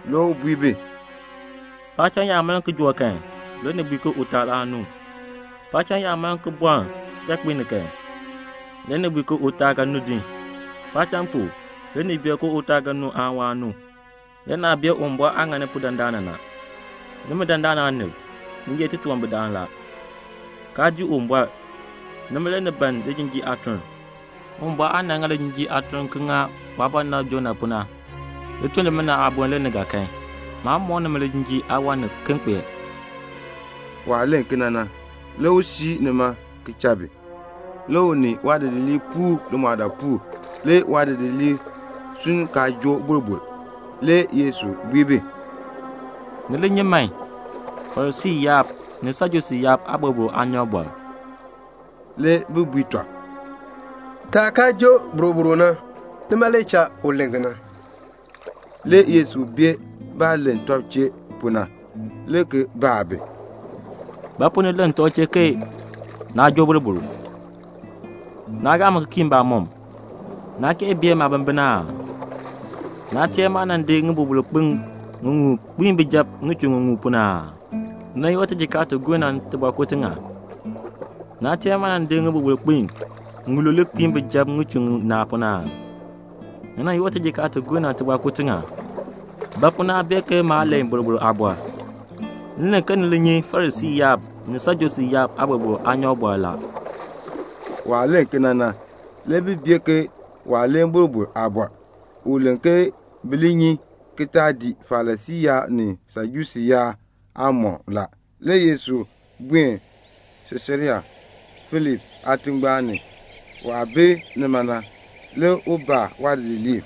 Le u bui bi, "Paacham yaa maln kijook kan le ni bui ke utaal aan nu. Paacham yaa maln ki bɔln kichakpiik ni kan, le ni bui ke utaal ga nu din. Paacham pu, le ni bee ke utaal ga nu aan waan nu. Le naa bee Uwumbɔr aah ŋani pu dandana na. Nimi dandana aanib, ni ye titunwambirdam la, kaa dii Uwumbɔr, nima le ni ban lijinjiir aatuln. Uwumbɔr aah nan ŋa lijinjiir aatuln ki ŋa waabɔnabr Jonah pu na, lituln limina aaboln le ni ga kan. Maan mɔk nimi lijinjiir aawan niken." Waah len kena na, le u siir nima ki cha bi. Le u ni waadidiliib puur limɔɔdaapuul. Le waadidiliib sunn kaa joo boroboro. Le Yesu bui bi, "Ni li nyi man Farisii yaab ni Sajusii yaab aaboroboro aanyɔk." Le bi bui tɔb, "Taah kaa joo boroboro na, nima le cha u len kena." Le Yesu bee baah len tɔb chee pu na, le ki baa bi, "Ba pu ni len tɔb chee ke naa joo boroboro? Naa gaa mi ki kii mbamɔm. Naa kee bee maabimbin aa? Naa teer maah nan di ŋiboroboro kpin ŋiŋmu ki di kpiin bijab ŋichur ŋiŋmu pu na aa? Ni nan yoor tijikaar ti gur na tibɔɔkur tiŋa? Naa teer maah nan di ŋiboroboro kpin ŋilule ki di kpiin bijab ŋichur ŋinaa pu na aa? Ni nan yoor tijikaar ti gur na tibɔɔkur tiŋa? Ba pu naa bee ke maa len boroboro aabɔr? M len ke ni li nyi Farisii yaab ni Sajusii yaab aaboroboro aanyɔk la." Waah len kena na, le bi bee ke waa len boroboro aabɔr. U len ke bi li nyi ki taa dii Farisii yaab ni Sajusii yaab aamɔkm. Le Yesu buen Siisarea Filipi aatingbaan ni. Waah bi nima na, le u baa waadidiliib,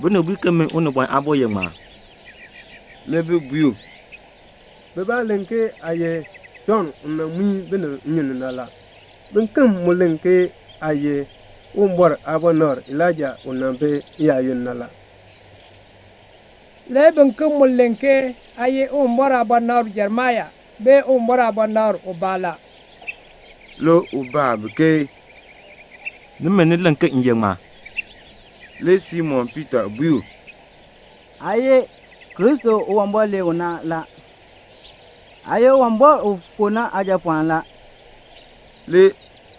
"Binib bui ke min Unibɔn Aabo ye ŋmaa?" Le bi bui u, "Bibaa len ke aa ye Jɔnn u nan muin binib nnyun ni, le biken mu len ke aa ye Uwumbɔr aabɔnabr Elaija u nan bi n-yaayoonn na la, le biken mu len ke aa ye Uwumbɔr aabɔnabr Jeremia aan Uwumbɔr aabɔnabr ubaa." Le u bui bi, "Nimi, ni len ke m ye ŋmaa?" Le Simon Piita bui u, "Aa ye Kristo u Uwumbɔr lee u na. Aa ye Uwumbɔr u fu na Aajapɔɔn la." Le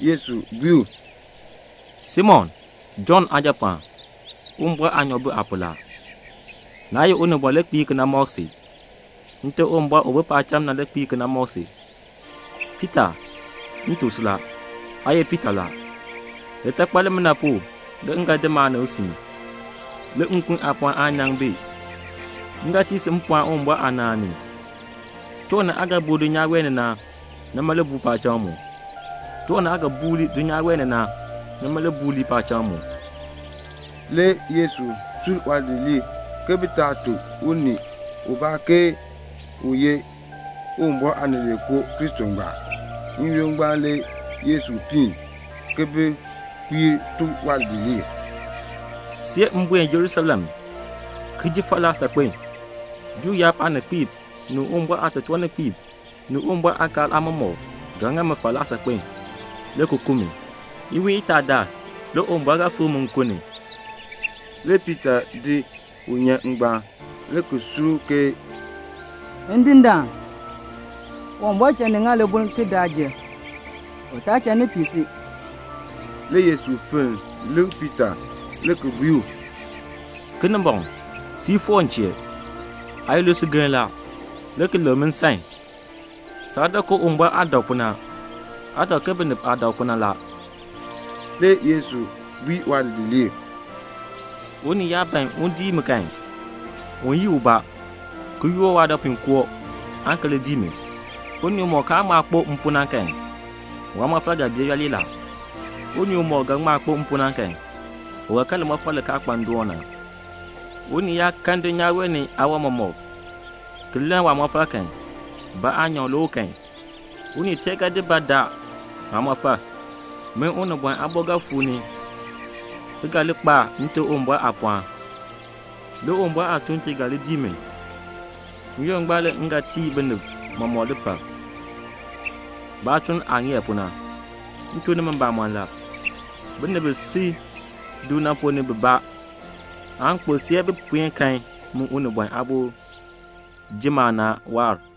Yesu bui u, "Simon, Jɔnn aajapɔɔn, Uwumbɔr aanyoor bi aa pu la. Naa ye unibɔn le kpiir kena ki mɔk si. Nte Uwumbɔr u bi paacham na le kpiir ki mɔk si. Piita, m tuk si la, aa ye litakpal. Litakpal limina pu le m ga di maanib ki di siin. Le nkun aapɔɔn aan nyaŋ bi. M ga tii si mpɔɔn Uwumbɔr aanaan ni. Tiwan ni aa ga buu dulnyaa wee ni na, nima le buu paacham mu. Tiwan ni aa ga buur lii dulnyaa wee ni na, nima le buur lii paacham mu." Le Yesu sur waadidiliib ke bi taa tuk unii ubaa ke u ye Uwumbɔr Aanileekoo Kristo ngbaan. N-yoonn ngbaan le Yesu piin ki bi kpiir tuk waadidiliib, "See m buen Jerusalem ki ji falaa saakpen. Juu yaab aaninkpiib ni Uwumbɔr aatotoorninkpiib ni Uwumbɔr aakaal aamɔmɔkb ga ŋa mi falaa saakpen, le ki ku mi. Iwiin itaadaal le Uwumbɔr ga fikr mi nkun ni." Le Piita di u ki di nyan ngbaan, le ki kae u, "Ndindaan, Uwumbɔr cha ni ŋa libuln ki daa jer. U taa cha ni pii si." Le Yesu fenn Piita wɔb le ki bui u, "Kinimbɔŋ, siir foor m chee. Aa ye lisugeln la, le ki lek mi nsan. Saa dak ke Uwumbɔr aah dak pu na. Aa dak ke binib aah dak pu na la." Le Yesu bui waadidiliib, "Unii yaa ban un dii mi kan, un yii ubaa, ki yoor waadɔpuinkoo aan ki li dii mi. Unii umɔk kaan ŋma kpo m pu na kan, waamɔfal ga bee yooli la. Unii umɔk ga ŋma kpo m pu na kan, u ga kan limɔfal li kaa kpa ndoon na. Unii yaa kan dulnyaa wee ni aawan mɔmɔk ki lann waamɔfal kan, ba aanyoor le u kan? Unii tee ga di ba ki daa waamɔfal? Min Unibɔn Aabo ga fuu ni ki ga li kpa Nte Uwumbɔr aapɔɔn. Le Uwumbɔr aatuuntiib ga li dii mi. N-yoonn ngbaan le m ga tii binib mɔmɔk lipal, baatuln aah ŋeer pu na. M tuk nimi mbamɔn la, binib bi si du na ponn ni bibaa aan kpo see bi puen kan min Unibɔn Aabo ji maanaan waahr."